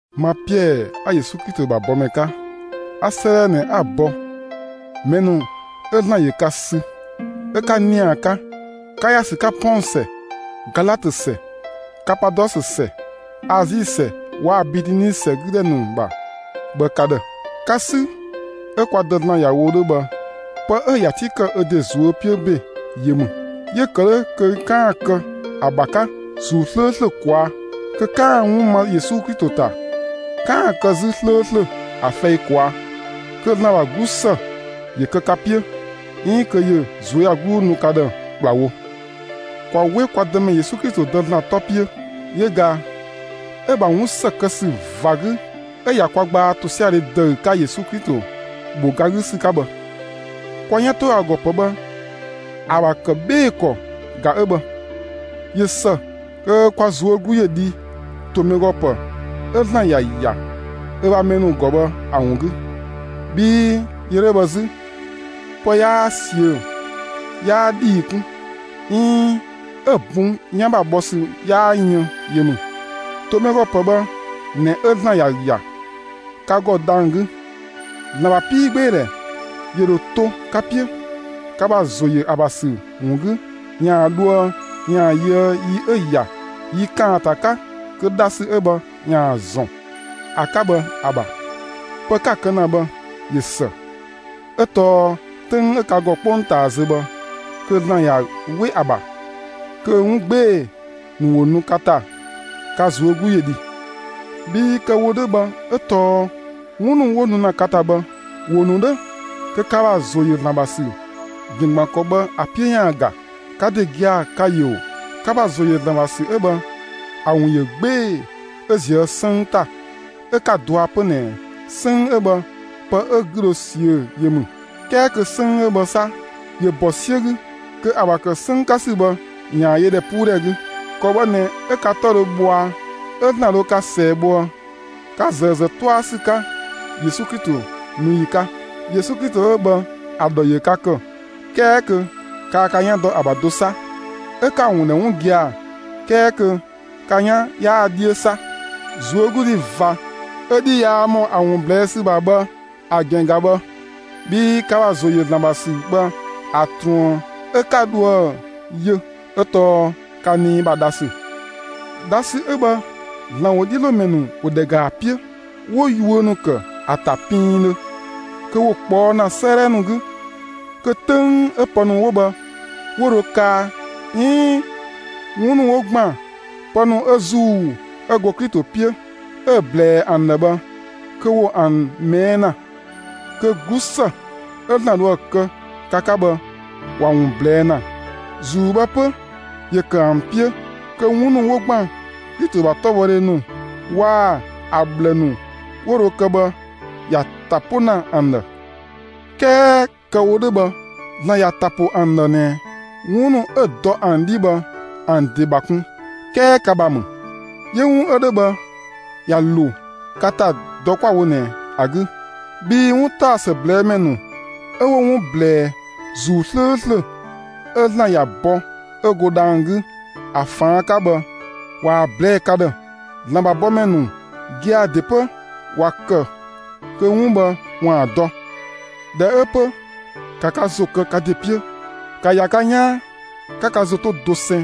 Ma Piɛɛ 'a Yesu Klito ‑bha bɔmɛ 'ka, 'a 'sëëdhɛ ꞊nɛ 'a‑ bɔ mɛ ‑nu 'ö ‑Zlan ‑yö ka sü 'ö 'ka ‑nia 'ka, 'ka ‑ya ‑sü 'ka Pɔng ‑sɛ, Galatö ‑sɛ, Kapadɔsö ‑sɛ, Azi ‑sɛ waa‑ Bitini ‑sɛ 'gü ‑dhɛ ‑nu ‑bha bhë ka ‑dhë. Ka 'sü 'ö kwa Dë ‑Zlan ‑ya wo 'dhö bhë, pë 'ö‑ ‑ya 'ti ‑kë ö ‑de ꞊zuö' 'piö ‑be yö ‑mü; 'yö‑ ‑kë 'dhö kö 'kaan‑ kë ‑a ‑bha 'ka ‑Zuu 'slööslö ꞊kwaa', kö 'kaan‑ 'wun ma Yesu Klito ‑ta, 'kaan‑ kë 'zü 'slööslö ‑a fɛi ꞊kwaa'. Kö ‑Zlan ‑bha 'glusë ‑yö kë ka 'piö, 'iin kö ‑yö ꞊zuöyagluu nu ka ‑dhë ‑kplawo. ‑Kwa 'we kwa Dëmɛ Yesu Klito Dë ‑Zlan 'tɔ 'piö! Yö ꞊ga 'ö‑ ‑bha 'wun ‑së kë ‑sü ꞊va 'gü 'ö ꞊ya kwa gbaa ‑tosiadhe ‑dëü 'ka Yesu Klito ‑bho ga 'gü ‑sü 'ka bhë. Kwa 'yan ‑to ‑a ‑gɔ ‑pë bhë ‑a ‑bha ‑kë 'bhee‑ ‑kɔ ꞊ga 'ö bhë. ꞊Yö ‑së kö kwa ꞊zuö' 'glu ‑yö dhi ‑to mɛ ‑gɔ ‑pë 'ö ‑Zlan ‑ya ‑ya ö ‑bha mɛ ‑nu ‑gɔ bhë ‑a ‑wun 'gü, bhii yö 'dhö bhë 'zü pë 'yaa ꞊siö', 'yaa ‑dhii 'kun 'iin 'ö‑ bun 'yan ‑bha bhɔ ‑sü 'yaa yën yö ‑mü. ‑To mɛ ‑gɔ ‑pë bhë ꞊nɛ 'ö ‑Zlan ‑ya ‑ya ka ‑gɔ dhang‑ 'gü. ‑Zlan ‑bha 'piigbeedhɛ ‑yö ‑dho to ka 'piö ka ‑bha ‑zo ‑yö ‑a ‑bha ‑sü ‑wun 'gü ‑yaan dhoë ‑yaan yöë yi 'ö‑ ‑ya yi ‑kaanta 'ka kö dhasü 'ö bhë ‑yaan ‑zɔn ‑a 'ka bhë ‑a ‑bha. Pë 'ka‑ kë ‑na bhë, ꞊yö ‑së 'ö tɔɔ 'töng 'ö ka ‑gɔ 'kpongtaa zö bhë, kö ‑Zlan ꞊ya 'we ‑a ‑bha kö 'wun 'gbee‑ ‑nu ‑wo nu ka ‑ta, ka ꞊zuö' 'glu ‑yö ‑dhi. Bhii kë‑ wo 'dhö bhë 'ö tɔɔ 'wun ‑nu 'wo nu ‑na ka ‑ta bhë, ‑wo ‑nu 'dhö kö ka ‑bha ‑zo ‑yö ‑Zlan ‑bha ‑sü ‑gɛn ‑gban ‑kɔ bhë 'piö ‑yaan ga. Ka ‑de gia‑ ka‑ ‑yö ‑o! Ka ‑bha ‑zo ‑yö ‑Zlan ‑bha ‑sü 'ö bhë ‑a ‑wun ‑yö 'gbee‑ 'ö ꞊zië' 'sënng ‑ta 'ö 'ka‑ dɔa 'pö ꞊nɛ 'sënng 'ö bhë pë 'ö‑ 'gü dho ꞊siö' yö ‑mü. 'Kɛɛ kö 'sënng 'ö bhë 'sa, ‑yö ‑bɔ 'siö 'gü kö ‑a ‑bha ‑kë 'sënng 'ka ‑sü bhë ‑yaan yö ‑dhɛpuudhɛ 'gü. ‑Kɔ bhë ꞊nɛ 'ö ka 'tɔ dhö bhɔa, 'ö ‑Zlan dho ka ꞊sɛɛ‑ bhoë, ka ꞊zëë ‑zë 'tɔa ‑sü 'ka Yesu Klito nu ‑yi 'ka. Yesu Klito 'ö bhë ‑a ‑dhɔ ‑yö ka ‑kë, 'kɛɛ kö kaa ka 'yan dɔ ‑a ‑bha do 'sa, 'ö 'ka‑ ‑wun ‑dhɛ 'wun gia‑, 'kɛɛ kö ka 'yan 'yaa‑ 'dhiö 'sa. ꞊Zuögludhi ꞊va 'ö 'dhi yaa ‑mɔ ‑a ‑wun ꞊blɛɛ' ‑sü ‑bha bhë ‑a ‑gɛn ꞊ga bhë. Bhii ka ‑bha ‑zo ‑yö ‑Zlan ‑bha ‑sü bhë ‑a ꞊truën 'ö 'ka dhoë‑ yö 'ö tɔɔ ka nii ‑bha dha ‑sü. Dhasü 'ö bhë, ‑Zlan ‑wodhiölomɛ ‑nu ‑wo ‑dhɛ ‑ga ‑a 'piö, 'wo yuö ‑nu ‑kë ‑a ‑ta piindhö, kö ‑wo ꞊kpɔɔ' ‑na 'sëëdhɛ ‑nu 'gü, kö 'töng 'ö pë ‑nu 'wo bhë 'wo dho kaa 'iin 'wun ‑nu 'wo ‑gban pë ‑nu 'ö ‑Zuu 'ö go Klito 'piö 'ö‑ ꞊blɛɛ ‑an ‑dhë bhë, kö ‑wo ‑an ꞊mɛɛ' ‑na; kö 'glusë 'ö ‑Zlan dhoë‑ kë ka 'ka bhë, ‑wa ‑wun ꞊blɛɛ' ‑na. ‑Zuu bhë 'pö, ‑yö ‑kë ‑an 'piö kö 'wun ‑nu 'wo ‑gban Klito ‑bha 'klobhɔdhe ‑nu waa‑ ‑a ꞊bhlë ‑nu 'wo dho kë bhë ‑ya ‑ta 'po ‑na ‑an ‑dhë. 'Kɛɛ kë‑ wo 'dhö bhë, ‑Zlan ‑ya ‑ta ‑po ‑an ‑dhë ꞊nɛ 'wun ‑nu 'ö‑ dɔ ‑an 'dhi bhë ‑an ‑de ‑bha kun, 'kɛɛ ka ‑bha ‑mü. 'Yö 'wun 'ö 'dhö bhë, ꞊ya ‑lo ka ‑ta dɔ 'kwa‑ wo ꞊nɛ ‑a 'gü, bhii 'wuntaɔsë ꞊blɛɛ' ‑mɛ ‑nu 'ö 'wo 'wun ꞊blɛɛ ‑Zuu 'slööslö 'ö ‑Zlan ‑ya bɔ 'ö go dhang‑ 'gü ‑a ꞊faan' 'ka bhë ꞊waa‑ ꞊blɛɛ'‑ ka ‑dhë. ‑Zlan ‑bha bɔmɛ ‑nu gia‑ ‑de 'pö ‑wa ‑kë kö 'wun bhë ‑waan dɔ. ꞊Dhɛ 'ö 'pö, ‑ka ka ‑zo kë ka ‑de 'piö; ‑ka ‑ya ka 'yaan, 'ka ka ‑zo 'to dosɛn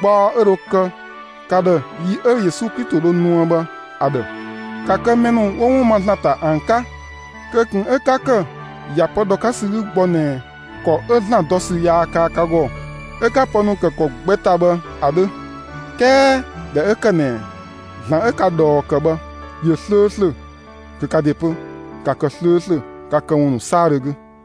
gbaɔ 'ö dho kë ka ‑dhë yi 'ö Yesu Klito dho nuë bhë ‑a ‑dhë! ‑Ka kë mɛ ‑nu 'wo 'wun ma ‑Zlan ‑ta ‑an 'ka; kö ꞊kun 'ö 'ka ‑kë ‑ya pë ‑dhɔ 'ka ‑sü 'gü gbɔ ꞊nɛ ‑kɔ 'ö ‑Zlan dɔ ‑sü yaa kaa ka ‑gɔ 'ö 'ka pë ‑nu ‑kë ‑kɔ gbɛ ‑ta bhë ‑a 'dhö. 'Kɛɛ ꞊dhɛ 'ö ‑kë ꞊nɛ ‑Zlan 'ö ka ꞊dhɔɔ ‑kë bhë ‑yö 'slööslö, kö ka ‑de 'pö, ‑ka kë 'slööslö ka këwun ‑nu 'saadhö 'gü!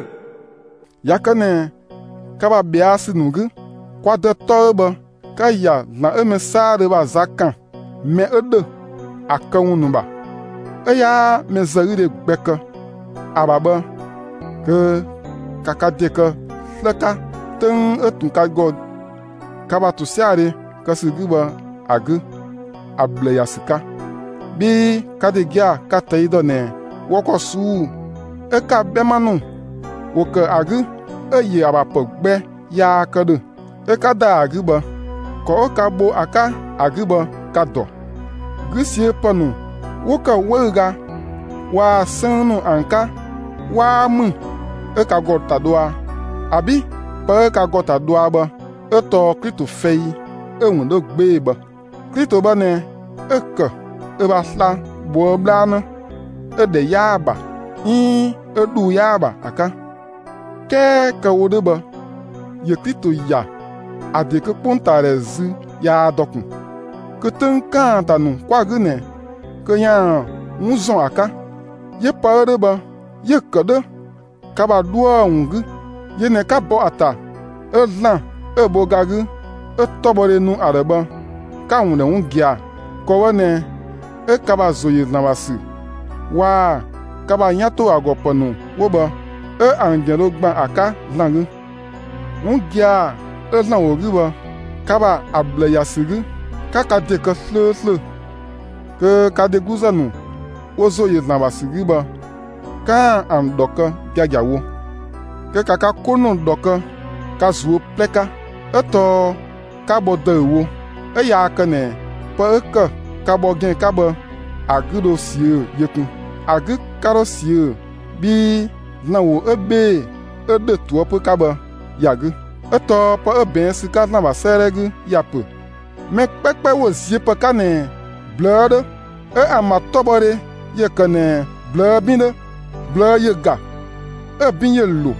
꞊Ya kë ꞊nɛ ka ‑bha ꞊bhɛa' ‑sü ‑nu 'gü, kwa Dë 'tɔ 'ö bhë ka‑ ‑ya ‑Zlan 'ö mɛ 'saadhö ‑bha za ‑kan mɛ 'ö ‑dhö ‑a këwun ‑nu ‑bha, 'ö 'yaa mɛzëgüdhe gbɛ kë ‑a ‑bha bhë, kö ‑ka ka ‑de kë 'slë 'ka 'töng 'ö ꞊tun ka ‑gɔ ka ‑bha ‑tosiadhe kë ‑sü 'gü bhë ‑a 'gü ‑a ꞊bhlë ‑ya ‑sü 'ka! Bhii ka ‑de gia‑ ka‑ ꞊tɛi' ‑dɔ ꞊nɛ wɔ ‑kɔ ꞊suu'‑ 'ö ka 'bhɛma ‑nu ‑wo ‑kë ‑a 'gü 'ö‑ ‑yö ‑a ‑bha ‑pë gbɛ yaa kë ‑dhö 'ö 'ka ‑da ‑a 'gü bhë, ‑kɔ 'ö ka bho ‑a 'ka ‑a 'gü bhë ka‑ ‑dɔ. 'Gü ꞊siö' ‑pë ‑nu 'wo ‑kë 'wëüga waa‑ 'sënng ‑nu ‑an 'ka 'waa ‑mü 'ö ka ‑gɔ ‑ta dhɔa. ‑Abi'! Pë 'ö ka ‑gɔ ‑ta dhɔa bhë 'ö tɔɔ Klito fɛi 'ö‑ ‑wun 'dhö 'gbee‑ bhë. Klito bhë ꞊nɛ 'ö‑ ‑kë ö ‑bha sla‑ ꞊bhoë' 'bhlanë 'ö‑ ‑dhɛ 'yaa‑ ‑bha 'iin 'ö ‑dhuu 'yaa‑ ‑bha ‑a 'ka. 'Kɛɛ kë‑ wo 'dhö bhë, ‑yö Klito ‑ya ‑a ‑de kö 'kpongtaadhɛ zü yaa dɔ ꞊kun, kö 'töng ‑kaanta ‑nu 'kwa‑ 'gü ꞊nɛ kö ‑yaan ‑wun ‑zɔn ‑a 'ka; 'yö pë 'ö 'dhö bhë, 'yö‑ ‑kë 'dhö ka ‑bha 'dhuë‑ ‑wun 'gü. Yö ꞊nɛ ka bɔ ‑a ‑ta 'ö ‑Zlan 'ö‑ bho ga 'gü 'ö 'tɔbhɔdhe nu ‑a ‑dhë bhë, 'ka‑ ‑wun ‑dhɛ 'wun gia‑. ‑Kɔ bhë ꞊nɛ 'ö ka ‑bha ‑zo ‑yö ‑Zlan ‑bha ‑sü waa‑ ka ‑bha 'yan ‑to ‑a ‑gɔ ‑pë ‑nu 'wo bhë, 'ö ‑an ‑gɛn dho ‑gban ‑a 'ka ‑Zlan 'gü. 'Wun gia‑ 'ö ‑Zlan ‑wo 'gü bhë, ka ‑bha ‑a ꞊bhlë ‑ya ‑sü 'gü, 'ka ka ‑de kë 'slööslö kö ka dhegluzë ‑nu 'wo ‑zo ‑yö ‑Zlan ‑bha ‑sü 'gü bhë, 'kaan‑ ‑an ‑dhɔ kë giagiawo. Kö ‑ka ka 'ko ‑nu ‑dhɔ kë ka ꞊zuö' 'plɛ 'ka; 'ö tɔɔ 'ka bhɔ ‑dëüwo; 'ö yaa kë ꞊nɛ pë 'ö ‑kë ka bhɔ ‑gɛn 'ka bhë ‑a 'gü ‑dho ꞊siö' yö kun. ‑A 'gü 'ka 'dho ꞊siö bhii ‑Zlan ‑wo 'ö 'bhee‑ 'ö ‑dhö ꞊toëpö 'ka bhë ‑ya 'gü. 'Ö tɔɔ pë 'ö ꞊bɛɛn' ‑sü 'ka ‑Zlan ‑bha 'sëëdhɛ 'gü ya ‑pö: Mɛ 'kpɛkpɛ ‑wo ziö ‑pë 'ka ꞊nɛ ꞊blëë' 'dhö, 'ö ‑an ‑bha 'tɔbhɔdhe ‑yö ‑kë ꞊nɛ ꞊blëë' 'bin 'dhö. ꞊Blëë' ‑yö ‑ga, 'ö‑ 'bin ‑yö ‑lo,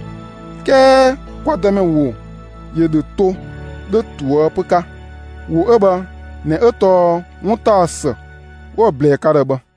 'kɛɛ kwa Dëmɛ ‑wo ‑yö ‑dho to 'dhö ꞊toëpö 'ka. ‑Wo 'ö bhë ꞊nɛ 'ö tɔɔ 'wuntaɔsë 'wo‑ ꞊blɛɛ ka ‑dhë bhë.